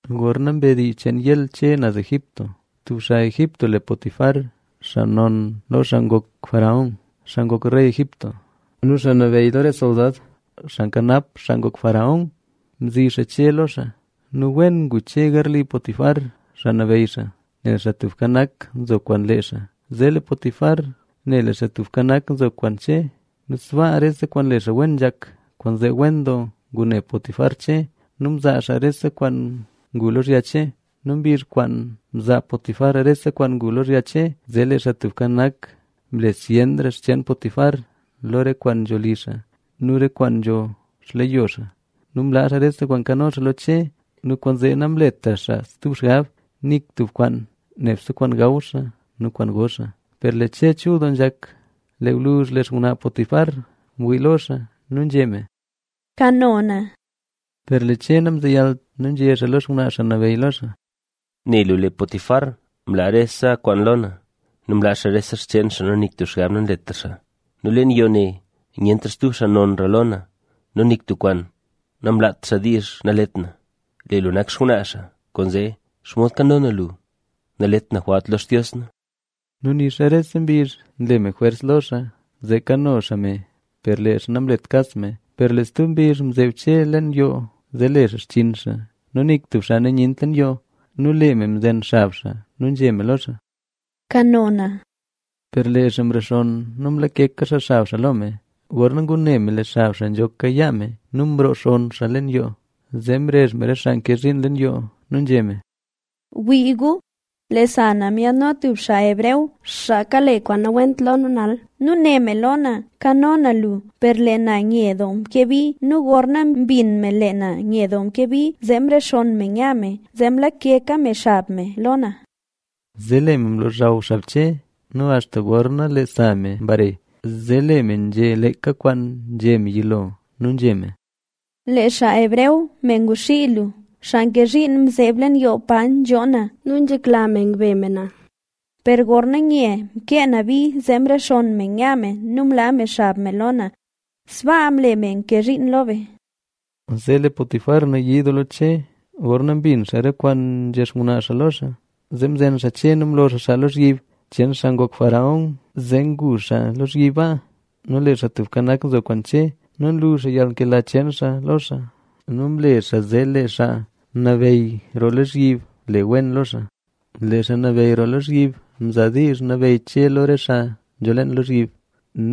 Gorna mbe dii cheen Ismael Che naz Egipto, tub xaa Egipto le Potifar, xaa non lo xaa ngok faraón xaa ngok rey Egipto nu xaa nabeyy lo re soldad, xaa nkanap xaa ngok faraón mzi xaa Che lo xaa. Nu wen ngu Che garli Potifar xaa nabeyy xaa, nel Xaa Tubka Nak nzo kwaan lee xaa. Zee lee Potifar ne lee Xaa Tubka Nak nzo kwaan Che nu sbaa rese kwaan nle xaa wen nzhak. Kwaanzee wen doo ngune Potifar Che nu mzaa xaa rese kwaan ngu lozhya Che. Nu mbizh kwaan mzaa Potifar rese kwaan ngu lozhya Che, zee lee xaa Xaa Tubka Nak mle zyenra xcheen Potifar, lo re kwaan nzho li xaa nu re kwaan nzaa xleyo xaa. Nu mlaa xaa rese kwaan nkano xaa lo Che nu kwaanzee namletra xaa stub xgab nik tub kwaan, nebse kwaan gaw xaa nu kwaan go xaa. Per lee Che chul doo nzhak. Lee gwluzh lee xngwnaa Potifar mwii lo xaa nu nzhé me: —Kano na. Per lee Che namzeyalt nu nzhé xaa lo xngwnaa xaa nabeyy lo xaa: —Ne lu lee Potifar mlaa rese kwaan lo na nu mlaa xaa rese xcheen xaa nu nik tub xgab nanletra xaa. Nu leen yoo ne nyentra stub xaa nonra lo na. Nu nik tub kwaan namlaat xaa diizh nalet na, nebse lu mlaa xaa nawiit na lo. Lee lu nak xngwnaa xaa, kwaanzee ¿xomod kano na lu? Nalet na jwalt lo Xtios na. Nu nixa rese mbizh nle me jwers lo xaa, zee kano xaa me, per lee xaa namlet kas me. Per lee stub mbizh mzeeb Che leen yoo, zee le xaa xchinn xaa nu nik stub xaa nyent leen yoo. Nu lee me mzen xab xaa nu nzhé me lo xaa: —Kano na. Per lee xaa mrexonn nu mlakeka xaa xab xaa lo me. Gorna ngune me lee xab xaa nzhoka yaa me nu mroo xaa leen yoo, zee mrezh me re xaa nke zhiin leen yoo nu nzhé me: —Wii gu, lee sa na myaadno tub me hebreo, me kale kwaan nawent lo nu nal nu né me lo na: “Kano na lu”. Per lee na nye doo mkee bi. Nu gorna mbin me lee na nye doo mkee bi, zee mrexonn me nya me, zee mlakeka me xab me lo na. Zee lee me mlozhaw xab Che nu axta gorna lee sa me mbare, zee lee me nzhé leeka kwaan nzhé me yilo. Nu nzhé me: —Lee me hebreo me ngwaxii lu, me nke zhiin mzeeb leen yoo pa nzhoo na nu nzhekla me ngbe me na, per gorna nye mkee na bi, zee mrexonn me nya me nu mlaa me xab me lo na. ¡Sbaa mle me nke zhiin lo be! Zee lee Potifar nayii doo lo Che gorna mbin xaa re kwaan nzhé xngwnaa xaa lo xaa, zee mzen xaa Che nu mlo xaa xaa lozhyib cheen xaa ngok faraón, zee ngu xaa lozhyib. Nu lee Xaa Tubka Nak nzo kwaan Che nu nlu xaa yalnkela cheen xaa lo xaa; nu mle xaa zee lee xaa nabeyy roo lozhyib le wen lo xaa. Lee xaa nabeyy roo lozhyib mzaa diizh nabeyy Che lo re xaa nzho leen lozhyib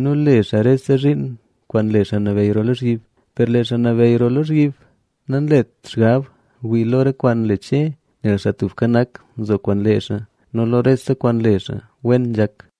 nu le xaa rese zhiin kwaan nle xaa nabeyy roo lozhyib. Per lee xaa nabeyy roo lozhyib nanlet xgab wii lo re kwaan nle Che, nel Xaa Tubka Nak nzo kwaan lee xaa nu lo rese kwaan nle xaa, wen nzhak.